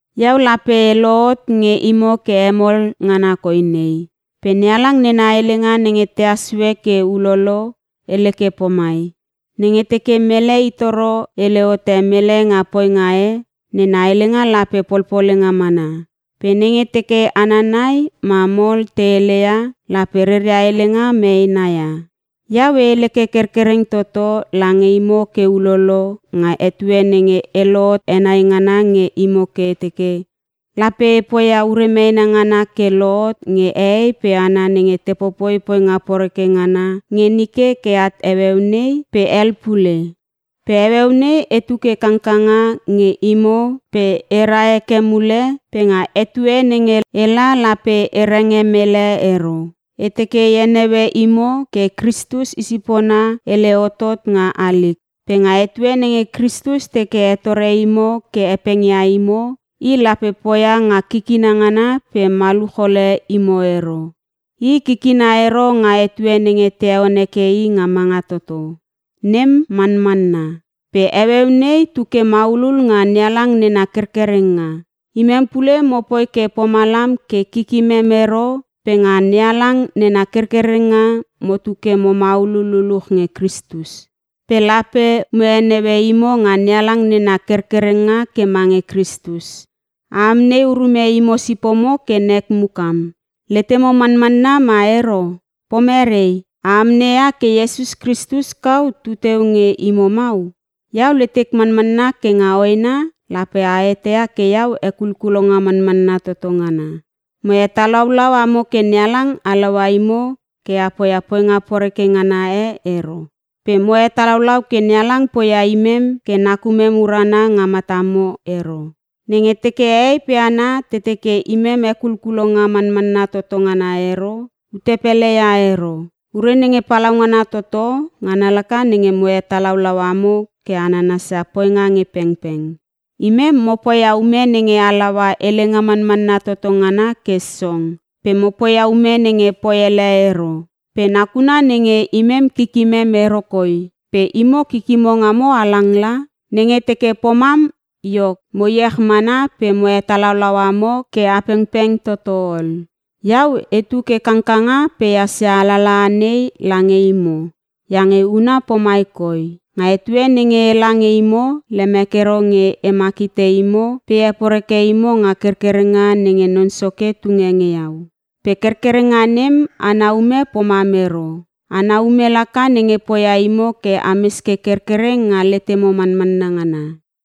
Iau lape e lohot nge imo ke hemol ngana koi nei. Pe NeHalang nena helenga nenge tehas sue ke ulolo, hele ke pomai, “Nenge teke mele i toro hele hote mele nga poinga e, nena helenga lape polpolenga mana. Pe nenge teke hana nai ma mol te heleia lape reria helenga meena ia.” Iau e hele ke kerkereng toto lange imo ke ulolo nga etue nenge e lohot henai ngana nge imo ke e teke, lape e poia ure meena ngana ke lohot nge hehei pe hana nenge te popoi poinga poreke ngana nge nike ke at heueu nei pe hel pule. Pe heueu nei etu ke kangkanga nge imo pe era heke mule pe nga etue nenge ela lape e renge mele ero. E teke e heneue imo ke Kristus i sipona hele hotot nga halik. Pe nga etue nenge Kristus teke hetore imo ke hepengia imo, i lape poia nga kikina ngana pe maluch ole imo ero. I kikina ero nga etue nenge te heon heke i nga manga toto. Nem manmanna. Pe heueu nei tu ke maulul nga NeHalang nena kerkerenga. Imem pule mopoi ke pomalam ke kikimem ero pe nga NeHalang nena kerkerenga motu ke mo maulul luluch nge Kristus. Pe lape mo heneue imo nga NeHalang nena kerkerenga ke mange Kristus. A amnei urume imo sipomo ke nek mukam; letemo manmanna ma ero? Pomerei? A amneia ke Iesus Kristus kau tuteu nge imo mau? Iau letek manmanna ke nga hoena lape a eteia ke iau hekulkulonga manmanna toto ngana. Mo hetalaulau amo ke NeHalang halaua imo ke a poia poinga poreke ngana e ero. Pe mo hetalaulau ke NeHalang poia imem ke nakumem urana nga matamo ero. Nenge teke hehei pe hana te teke imem hekulkulonga manmanna toto ngana ero, ute pele ia ero. Ure nenge palaungana toto ngana laka nenge mo hetalaulau amo ke a nanasia poinga nge pengpeng. Imem mo poia ume nenge halaua helenga manmanna toto ngana ke song, pe mo poia ume nenge poi ele ero. Pe nakuna nenge imem kikimem ero koi pe imo kikimo ngamo halang la. Nenge teke pomam iok, mo iech mana pe mo hetalaulau amo ke a pengpeng toto ol. Iau etu ke kangkanga pe ehas ia alalaha nei lange imo iange huna pomai koi: Nga etue nenge ela nge imo, lemek ero nge emak hite imo pe e heporeke imo nga kerkerenga nenge Non Soke tunge nge iau. Pe kerkerenga nem ana ume pomam ero, ana ume laka nenge poia imo ke ames ke kerkereng nga letemo manmanna ngana.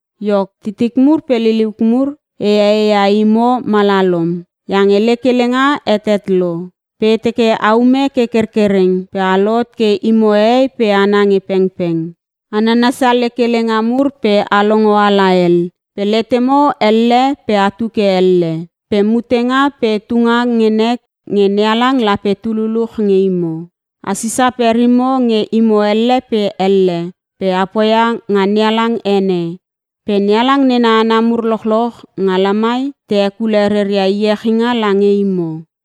Iok titik mur pe liliuk mur, e ee ia imo malalom iange lek helenga hetet lo. Pe e teke aume ke kerkereng pe a lohot ke imo hehei pe hana nge pengpeng. A nanasia lek helenga mur pe (a longo ala hel) pe letemo elle pe atu ke elle. Pe mutenga pe tunga nge nek nge NeHalang lape tu luluch nge imo. A sisa perimo nge imo elle pe elle pe a poia nga NeHalang ene. Pe NeHalang nena hana mur lochloch nga lamai te hekule reria iechinga lange imo.